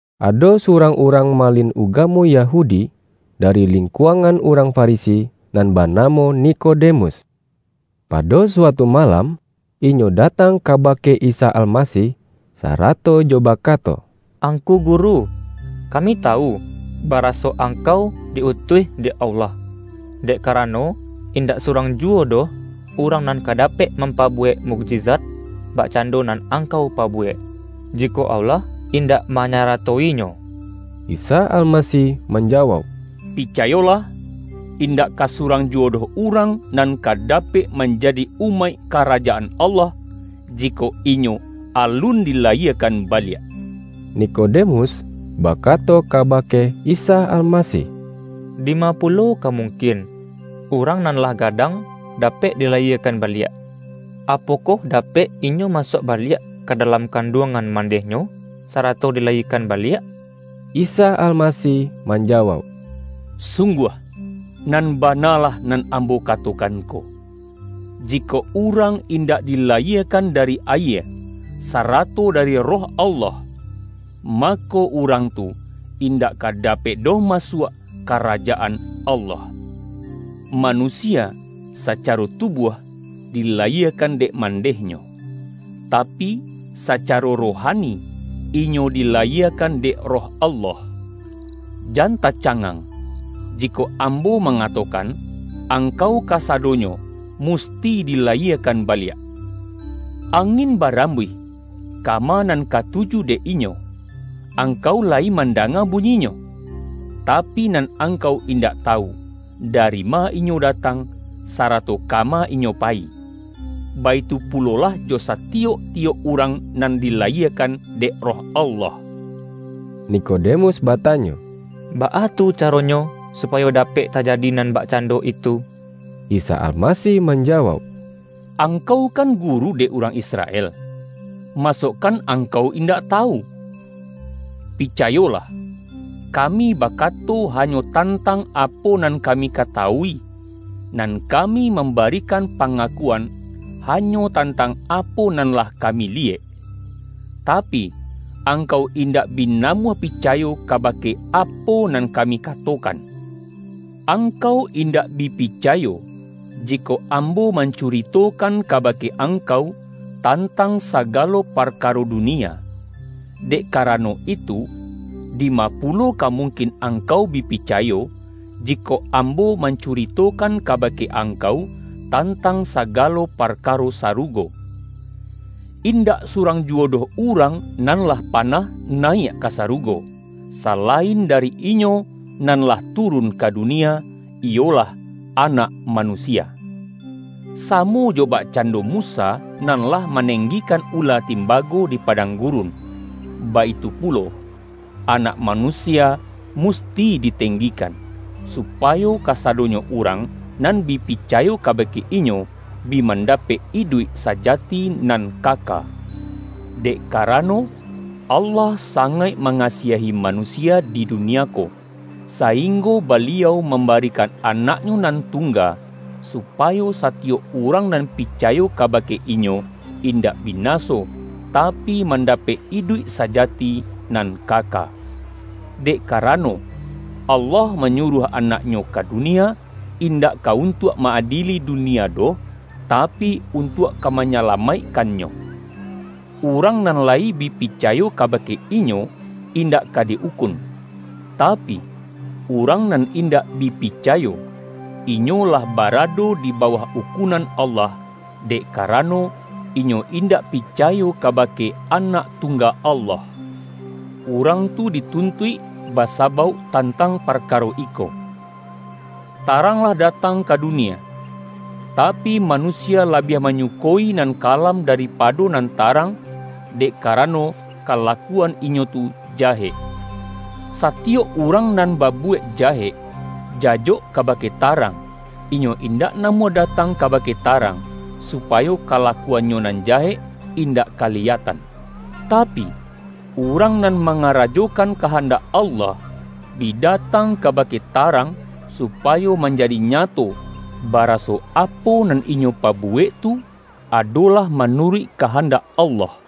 Ado surang urang malin ugamo Yahudi, dari lingkuangan urang Farisi, nan banamo Nikode-mus. Pado suatu malam, inyo da-tang kabake Isa Almasih, sarato jo bakato,”Angku Guru, kami tawu, baraso Angkau di-utuih dek Allah. Dek karano, indak surang juwo doh urang nan ka dapek mampabuwek mukjizat, bakcando nan Angkau pa-buwek, jikok Allah indak manyara-to-inyo.” Isa Almasih manjawauk,”Picayo-lah, indak ka surang juwo doh urang nan ka dapek manjadi umaik Kara-jaan Allah, jikok inyo alun dilayie-kan baliak.” Nikodemus bakato kabake Isa Almasih,”Dima pulo ka mungkin, urang nan lah gadang dapek dilayie-kan baliak? Apokoh dapek inyo masuak baliak ka dalam kanduangan mandeh-nyo, sarato dilayiekan baliak?” Isa Almasih manjawauk,”Sungguah, nan bana lah nan Ambo katokan ko: ji-kok urang indak dilayiekan dari ayie, sarato dari Roh Allah, mako, urang tu indak ka dapek doh masuak Karajaan Allah. Manusia sacaro tubuah, dila-yiekan dek mandehnyo, tapi, sacaro ro-hani, inyo dilayiekan dek Roh Allah. Jan tacangang, jikok Ambo manga-tokan: angkau kasadonyo musti dila-yiekan baliak. Angin barambuih, ka-ma nan katuju dek inyo, angkau layi mandanga bunyinyo, tapi, nan ang-kau indak tawu, dari ma inyo datang sarato kama inyo payi. Baitu pulolah jo satiyok-tiyok urang nan dilayiekan dek Roh Allah.” Nikodemus batanyo,”Baa tu ca-ronyo, supayo dapek tajadi nan bak-cando itu?” Isa Almasih manjawauk,”Ang-kau kan guru dek urang Israel, ma-sokan angkau indak tawu? Picayo-lah: kami bakato hanyo tantang apo nan kami katawui, nan kami mamba-rikan pangakuan hanyo tantang apo nan lah kami liyek. Tapi, angkau in-dak bi namuah picayo kabake apo nan kami katokan. Angkau indak bi pi-cayo, jikok Ambo mancuritokan ka-bake angkau, tantang sagalo parkaro dunia. Dek karano itu, dima pulo ka mungkin angkau bi picayo, jikok Am-bo mancuritokan kabake angkau, tan-tang sagalo parkaro sarugo. Indak surang juwo doh urang nan lah pa-nah nayiak ka sarugo, salain dari Inyo nan lah turun ka dunia, iyolah, Anak Manusia. Samo jo bakcando Musa nan lah manenggikan ula timbago di padang gurun, baitu pulo, Anak Manusia mus-ti ditenggikan, supayo kasadonyo urang nan bi picayo kabake Inyo, bi mandapek iduik sajati nan kaka.” Dek karano, Allah sangaik ma-ngasiahi manusia di dunia ko, saing-go Baliau mambarikan Anak-Nyo nan tungga, supayo satiyok urang nan pi-cayo kabake Inyo indak binaso, tapi mandapek iduik sajati nan kaka. Dek karano, Allah manyuruah Anak-Nyo ka dunia, indak ka untuak ma-adieli dunia doh, tapi, untuak ka manyala-maikkannyo. Urang nan layi bi pi-cayo kabake Inyo, indak ka di-ukun. Tapi, urang nan indak bi picayo, inyo lah barado di bawah ukunan Allah, dek karano, inyo indak picayo kaba-ke Anak Tungga Allah. Urang tu di-tuntuik basabauk tantang parkaro iko: Tarang lah datang ka dunia, tapi, ma-nusia labiah manyukoi nan kalam da-ripado nan tarang, dek karano, kala-kuan inyo tu jahek. Satiyok urang nan babuwek jahek, jajok kabake ta-rang, inyo indak namuah datang ka-bake tarang, supayo kalakuannyo nan jahek indak kaliyatan. Tapi, urang nan mangarajokan kahandak Allah, bi datang kabake tarang, supayo man-jadi nyato, baraso apo nan inyo pa-buwek tu, adolah manuruik kahan-dak Allah.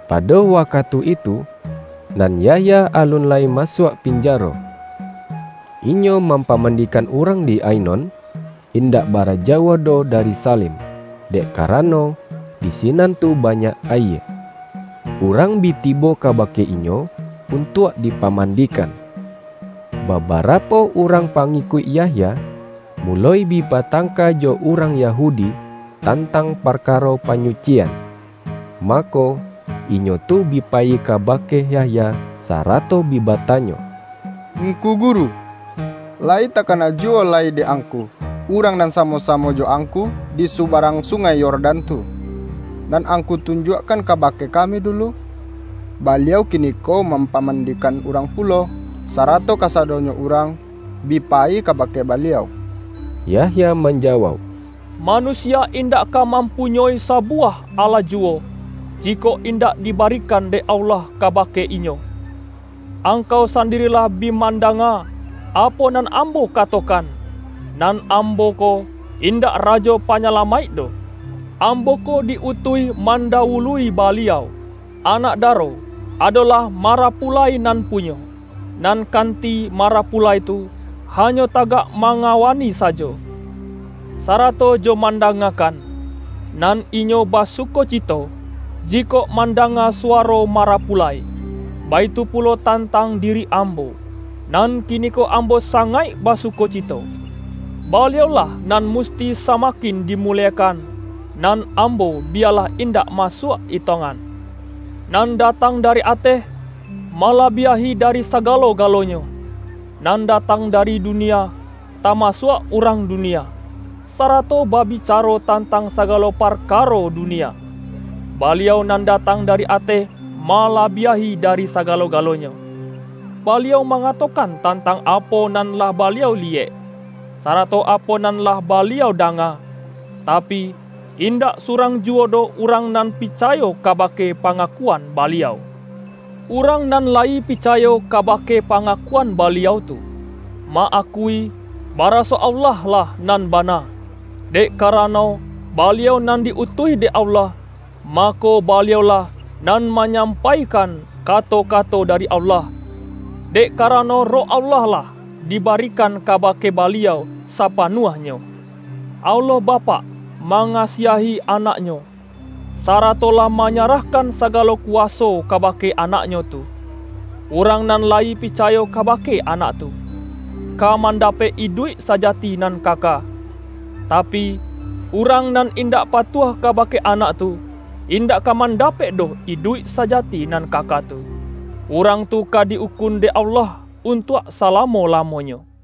pado wakatu itu, nan Yahya alun lai masuak pinjaro. Inyo mampamandikan urang di Ai-non, indak bara jauah doh dari Sa-lim, dek karano, di sinan tu banyak ayie. Urang bi tibo kabake inyo, un-tuak dipamandikan. Babarapo urang pangikuik Yah-ya, muloi bi batangka jo urang Yahudi, tantang parkaro panyucian. Mako, inyo tu bi payi kabake Yahya, sarato bi batanyo,”Ngku guru, layi takana juwo lai dek angku, Urang nan samo-samo jo angku di subarang Sungai Yor-dan tu, nan angku tunjuakkan kabake kami dulu? Baliau kiniko mampaman-dikan urang pulo, sarato kasadonyo urang bi payi kabake Baliau!” Yahya manjawauk,”Manusia indak ka mampunyoi sabuwah alah juwo, ji-kok indak dibarikan dek Allah kabake inyo. Angkau sandiri lah bi manda-nga, apo nan ambo katokan, ’Nan am-bo ko, indak Rajo Panyalamaik doh. Ambo ko di-utuih mandawului Baliau.’ Anak daro, adolah marapu-lai nan punyo. Nan kanti marapulai tu, hanyo tagak mangawani sajo, sa-rato jo mandangakan, nan inyo basu-kocito jikok mandanga suwaro mara-pulai. Baitu pulo tantang diri ambo. Nan kiniko ambo sangaik basukoci-to. Baliau-lah nan musti samakin dimuliekan, nan ambo biyalah indak masuak etongan.” Nan datang dari ateh, malabiahi dari sagalo-galonyo. Nan datang dari dunia, tamasuak urang dunia, sarato babicaro tantang sagalo parkaro du-nia. Baliau nan datang dari ateh ma-labiahi dari sagalo-galonyo. Baliau mangatokan tantang apo nan lah Baliau liyek, sarato apo nan lah Baliau danga, tapi, indak surang juwo doh urang nan picayo kabake pangakuan Baliau. Urang nan layi picayo ka-bake pangakuan Baliau tu, ma-akui, baraso Allah lah nan bana. Dek ka-rano Baliau nan di-utuih dek Allah, mako Baliau-lah nan manyampaikan kato-kato dari Allah, dek karano Roh Allah lah dibarikan kabake Baliau sa-panuahnyo. Allah Bapak manga-siahi Anak-Nyo, sarato lah manyarah-kan sagalo kuwaso kabake Anak-Nyo tu. Urang nan layi picayo kabake Anak tu, ka mandapek iduik sajati nan kaka. Tapi, urang nan indak patuah kabake Anak tu, indak ka mandapek doh iduik sajati nan kaka tu. Urang tu ka di-ukun dek Allah untuak sala-mo-lamonyo. YAHYA